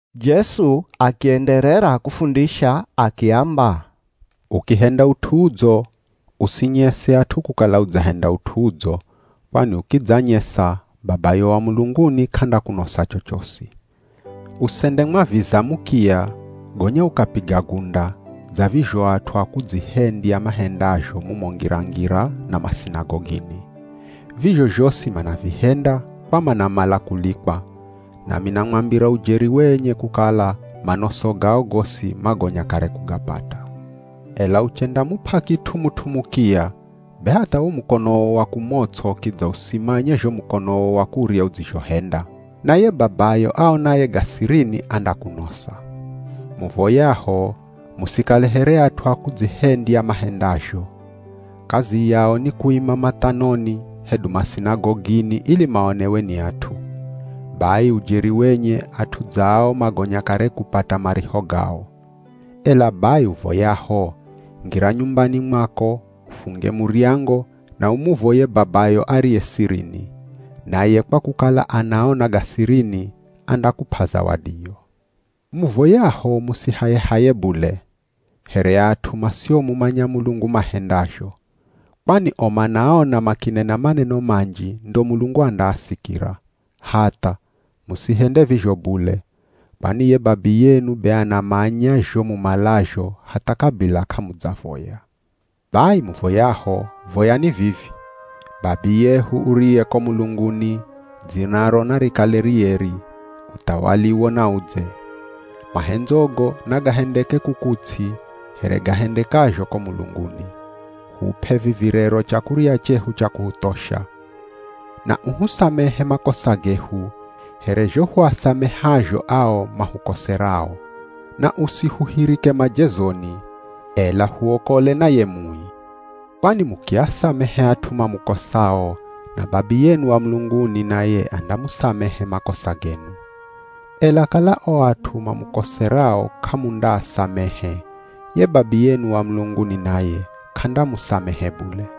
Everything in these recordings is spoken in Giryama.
Jesu akienderera kufundisha akiamba, “Ukihenda ut'u udzo, usinyese at'u kukala udzahenda ut'u udzo, kwani ukidzanyesa Babayo wa mulunguni k'andakunosa chochosi. Usendemwaviza mukiya, gonya ukapiga gunda, dza vizho at'u a kudzihendya mahendazho mumo ngira-ngira na masinagogini. Vizho zhosi manavihenda kwa manamala kulikwa, nami namwambira ujeri wenye kukala manoso gao gosi magonya kare kugapata. Ela uchendamup'a kit'u mut'u mukiya be hatha wo mukonowo wa kumots'o kidza usimanye zho mukonowo wa kurya udzizhohenda. Naye Babayo aonaye ga sirini andakunosa.” “Muvoyaho, musikale here at'u a kudzihendya mahendazho. Kazi yao ni kuima mathanoni hedu masinagogini ili maonewe ni at'u. Bai ujeri wenye at'u dza ao magonya kare kupata mariho gao. Ela bai, uvoyaho, ngira nyumbani mwako ufunge muryango na umuvoye Babayo ariye sirini, naye kwa kukala anaona ga sirini, andakup'a zawadiyo. Muvoyaho musihaye-haye bule, here at'u masiomumanya Mulungu mahendazho. Kwani o manaona makinena maneno manji ndo Mulungu andaasikira. Hatha, musihende vizho bule. Kwani ye Babiyenu be anamanya zho mumalazho hatha kabila k'amudzavoya. Bai muvoyaho, voyani vivi: Babiyehu uriye ko mulunguni, dzinaro narikale rieri, Uthawaliwo naudze. Mahendzogo nagahendeke kuku ts'i, here gahendekazho ko mulunguni. Hup'e vivi rero chakurya chehu cha kuhuthosha. Na uhusamehe makosa gehu, here zho huasamehazho ao mahukoserao. Na usihuhirike majezoni, ela huokole na ye Mui. “Kwani mukiasamehe at'u mamukosao, na Babiyenu wa mulunguni naye andamusamehe makosa genu. Ela kala o at'u mamukoserao k'amundaasamehe, ye Babiyenu wa mulunguni naye k'andamusamehe bule.”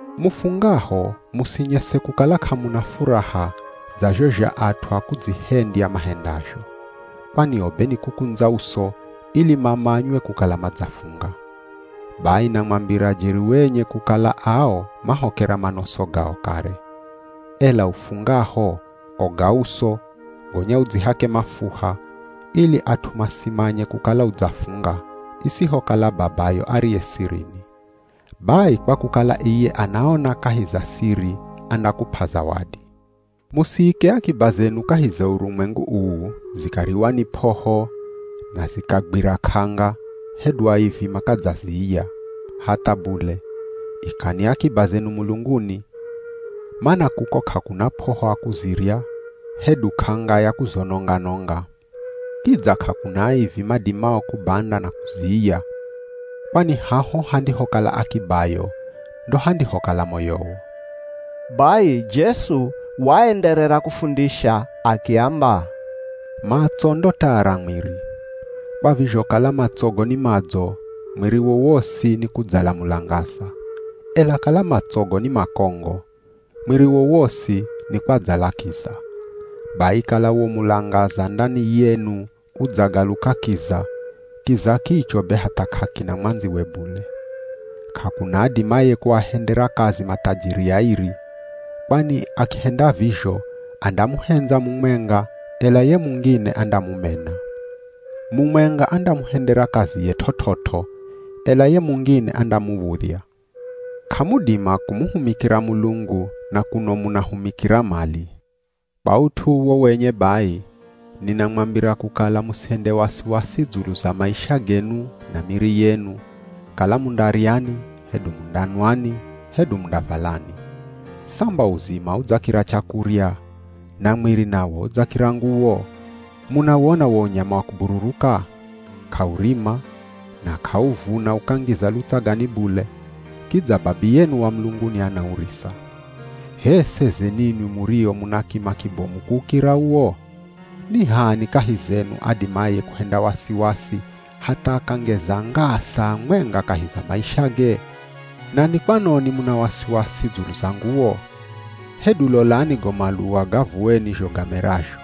“Mufungaho musinyese kukala k'amuna furaha dza zho at'u a kudzihendya mahendazho. Kwani o be ni kukundza uso, ili mamanywe kukala madzafunga. Bai namwambira jeri wenye kukala ao mahokera manoso gao kare. Ela ufungaho, oga uso, gonya udzihake mafuha, ili at'u masimanye kukala udzafunga, isihokala Babayo ariye sirini. Bai kwa kukala iye anaona kahi za siri andakup'a zawadi.” “Musiike akiba zenu kahi za urumwengu uu, zikariwa ni p'oho, na zikagwira k'anga, hedu aivi makadzaziiya. Hatha bule, ikani akiba zenu mulunguni. Mana kuko k'akuna p'oho a kuzirya, hedu k'anga ya kuzononga-nonga. Kidza k'akuna aivi madimao kubanda na kuziiya. Kwani haho handihokala akibayo, ndo handihokala moyowo.” Bai Jesu waenderera kufundisha akiamba, “Matso ndo taa ra mwiri. Kwa vizho kala matsogo ni madzo, mwiriwo wosi nikudzala mulangaza. Ela kala matsogo ni makongo, mwiriwo wosi nikwadzala kiza. Bai kala wo mulangaza ndani yenu udzagaluka kiza, kiza kicho be hatha k'akina mwandziwe bule. K'akuna adimaye kuahendera kazi mathajiri airi. Kwani akihenda vizho, andamuhendza mumwenga ela ye mungine andamumena. Mumwenga andamuhendera kaziye t'ot'ot'o, ela ye mungine andamuv̱udhya. K'amudima kumuhumikira Mulungu na kuno munahumikira mali.” “Kwa ut'u uwo wenye bai, ninamwambira kukala musihende wasiwasi dzulu za maisha genu na miri yenu, kala mundaryani, hedu mundanwani, hedu mundavalani. Samba uzima udzakira chakurya, na mwiri nawo udzakira nguwo? Munawona wo unyama wa kubururuka? K'aurima, na k'auvuna ukangiza lutsagani bule, kidza Babiyenu wa mulunguni anaurisa. H'e seze ninwi murio muna kima kibomu kuukira uwo? Ni h'ani kahi zenu adimaye kuhenda wasiwasi hatha akangeza ngaa saa mwenga kahi za maishage? Na ni kwanoni muna wasiwasi dzulu za nguwo? Hedu lolani go maluwa ga vuweni zho gamerazho.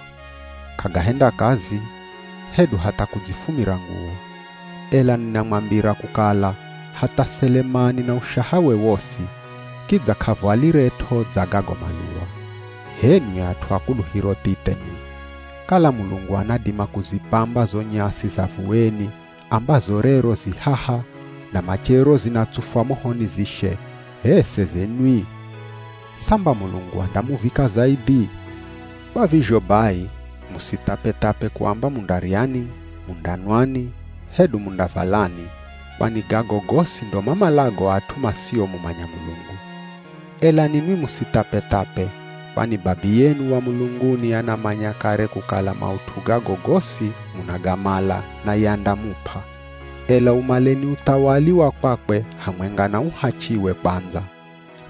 K'agahenda kazi, hedu hatha kudzifumira nguwo. Ela ninamwambira kukala, hatha Selemani na ushahawe wosi, kidza k'avwaliret'o dza gago maluwa. H'enwi at'u a kuluhiro thithe nwi! Kala Mulungu anadima kuzipamba zo nyasi za vuweni ambazo rero zi haha na machero zinatsufwa mohoni zishe, h'e seze nwi. Samba Mulungu andamuvika zaidhi? Kwa vizho bai, musithapethape kuamba mundaryani, mundanwani, hedu mundavalani, kwani gago gosi ndo mamalago at'u masiomumanya Mulungu. Ela ninwi musithapethape, kwani Babiyenu wa mulunguni anamanya kare kukala maut'u gago gosi munagamala naye andamup'a. Ela umaleni uthawali wa kwakwe hamwenga na uhachiwe kwandza,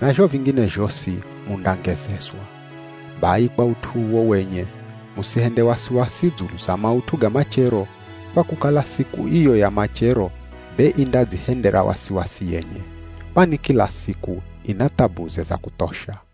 na zho vingine zhosi mundangezezwa. Bai kwa ut'u uwo wenye, musihende wasiwasi dzulu za maut'u ga machero, kwa kukala siku iyo ya machero be indadzihendera wasiwasi yenye. Kwani kila siku ina thabuze za kuthosha.”